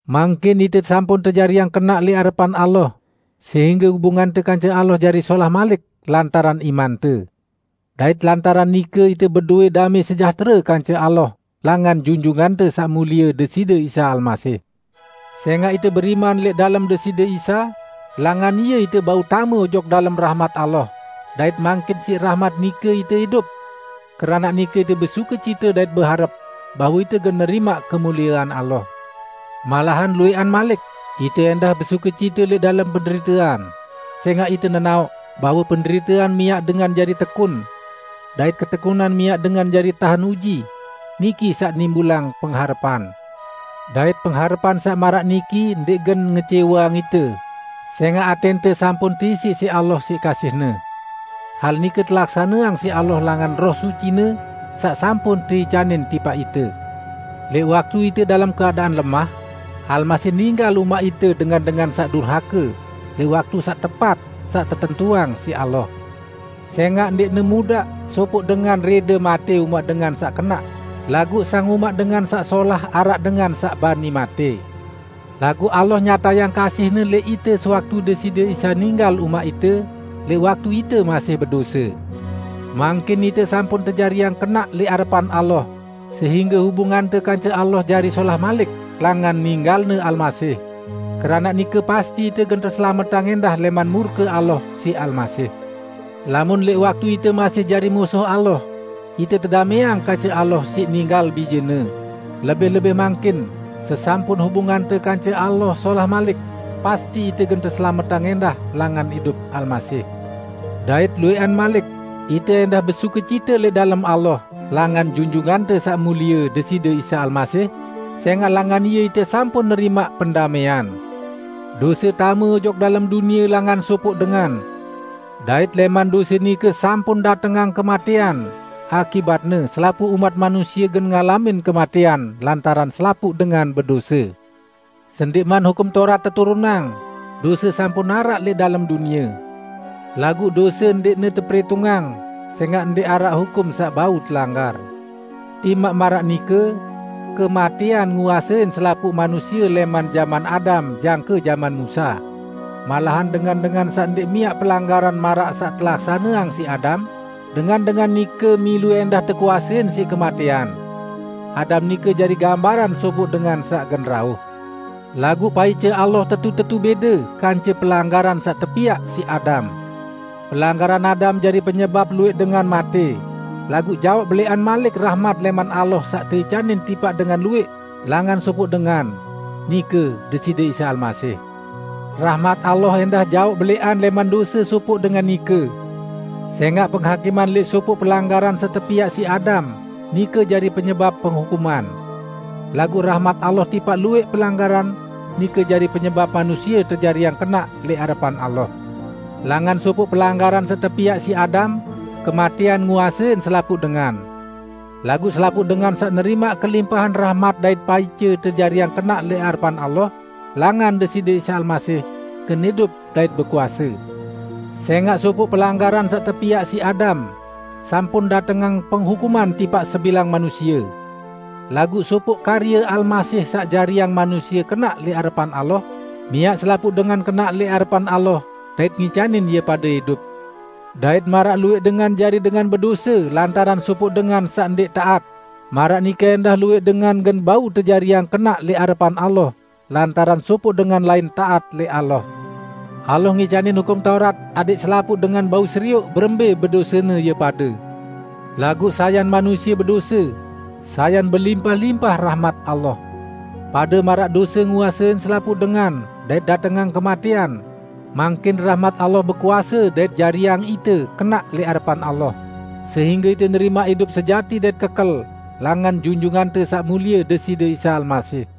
Mangkin ite sampun tejariang kenaq lẽq arepan Allah sehingge hubungante kance Allah jari solah malik lantaran imante. Dait lantaran nike ite bedowẽ damẽ sejahtere kance Allah langan Junjungante Saq Mulie Deside Isa Almasih. Sẽngaq ite beriman lẽq dalem Deside Isa, langan Ie ite bau tame ojok dalem rahmat Allah, dait mangkin siq rahmat nike ite idup. Keranaq nike ite besukecite dait beharep bahwe ite gen nerimaq kemuliean Allah! Malahan luwẽqan malik, ite ẽndah besukecite lẽq dalem penderitean, sẽngaq ite nenaoq bahwe penderitean miaq dengan jari tekun. Dait ketekunan miaq dengan jari tahen uji; niki saq nimbulang pengharepan. Dait pengharepan saq maraq niki ndẽq gen ngecẽweang ite, sẽngaq atẽnte sampun teisiq siq Allah siq kasih-Ne. Hal nike telaksaneang siq Allah langan Roh Suci-Ne, saq sampun teicanin tipaq ite. Lẽq waktu ite dalem keadaan lemah, Almasih ninggal umaq ite dengan-dengan saq durhake, lẽq waktu saq tepat saq tetentuang siq Allah. Sẽngaq ndẽqne mudaq sopoq dengan rẽde matẽ umaq dengan saq kenaq, laguq sang umaq dengan saq solah araq dengan saq bani matẽ. Laguq Allah nyatayang kasih-Ne lẽq ite sewaktu Deside Isa ninggal umaq ite, lẽq waktu ite masih bedose. Mangkin ite sampun tejariang kenaq lẽq arepan Allah sehingge hubungante kance Allah jari solah malik langan ninggal-Ne Almasih; keranaq nike pasti ite gen teselametang ẽndah lẽman murke Allah siq Almasih. Lamun lẽq waktu ite masih jari musuh Allah, ite tedamẽang kance Allah siq ninggal Bije-Ne, lebih-lebih mangkin sesampun hubungante kance Allah solah malik, pasti ite gen teselametang ẽndah langan idup Almasih. Dait luwẽqan malik, ite ẽndah besukecite lẽq dalem Allah langan Junjungante Saq Mulie Deside Isa Almasih, sẽngaq langan Ie ite sampun nerimaq pendamẽan. Dose tame ojok dalem dunie langan sopoq dengan, dait lẽman dose nike sampun datengang kematẽan, akibatne, selapuq umat manusie gen ngalamin kematẽan, lantaran selapuq dengan bedose. Sendẽqman Hukum Taurat teturunang, dose sampun araq lẽq dalem dunie. Laguq dose ndẽqne teperitungang, sẽngaq ndẽq araq hukum saq bau telanggar. Timaq maraq nike, kematẽan nguasein selapuq manusie lẽman jaman Adam jangke jaman Musa, malahan dengan-dengan saq ndẽq miaq pelanggaran maraq saq telaksaneang siq Adam, dengan-dengan nike milu ẽndah tekuasein siq kematẽan. Adam nike jari gambaran sopoq dengan saq gen rauh. Laguq paice Allah tetu-tetu bẽde kance pelanggaran saq tepiaq siq Adam. Pelanggaran Adam jari penyebap luwẽq dengan matẽ, laguq jaoq belẽqan malik rahmat lẽman Allah saq teicanin tipaq dengan luwẽq, langan sopoq dengan, nike Deside Isa Almasih. Rahmat Allah ẽndah jaoq belẽqan lẽman dose sopoq dengan nike, sẽngaq penghakiman lẽq sopoq pelanggaran saq tepiaq siq Adam, nike jari penyebap penghukuman. Laguq rahmat Allah tipaq luwẽq pelanggaran, nike jari penyebap manusie tejariang kenaq lẽq arepan Allah. Langan sopoq pelanggaran saq tepiaq siq Adam kematẽan nguasein selapuq dengan. Laguq selapuq dengan saq nerimaq kelimpahan rahmat dait paice tejariang kenaq lẽq arepan Allah langan Deside Isa Almasih, gen idup dait bekuase. Sẽngaq sopoq pelanggaran saq tepiaq siq Adam, sampun datengang penghukuman tipaq sebilang manusie. Laguq sopoq karye Almasih saq jariang manusie kenaq lẽq arepan Allah, miaq selapuq dengan kenaq lẽq arepan Allah dait ngicanin ie pade idup. Dait maraq luwẽq dengan jari dengan bedose lantaran sopoq dengan saq ndẽq taat, maraq nike ẽndah luwẽq dengan gen bau tejariang kenaq lẽq arepan Allah lantaran sopoq dengan lain taat lẽq Allah. Allah ngicanin Hukum Taurat adẽq selapuq dengan bau serioq berembẽ bedosene ie pade, laguq sayan manusie bedose, sayan belimpah-limpah rahmat Allah. Pade maraq dose nguasein selapuq dengan dait datengang kematẽan, mangkin rahmat Allah bekuase dait jariang ite kenaq lẽq arepan Allah, sehingge ite nerimaq idup sejati dait kekel langan Junjungante Saq Mulie Deside Isa Almasih.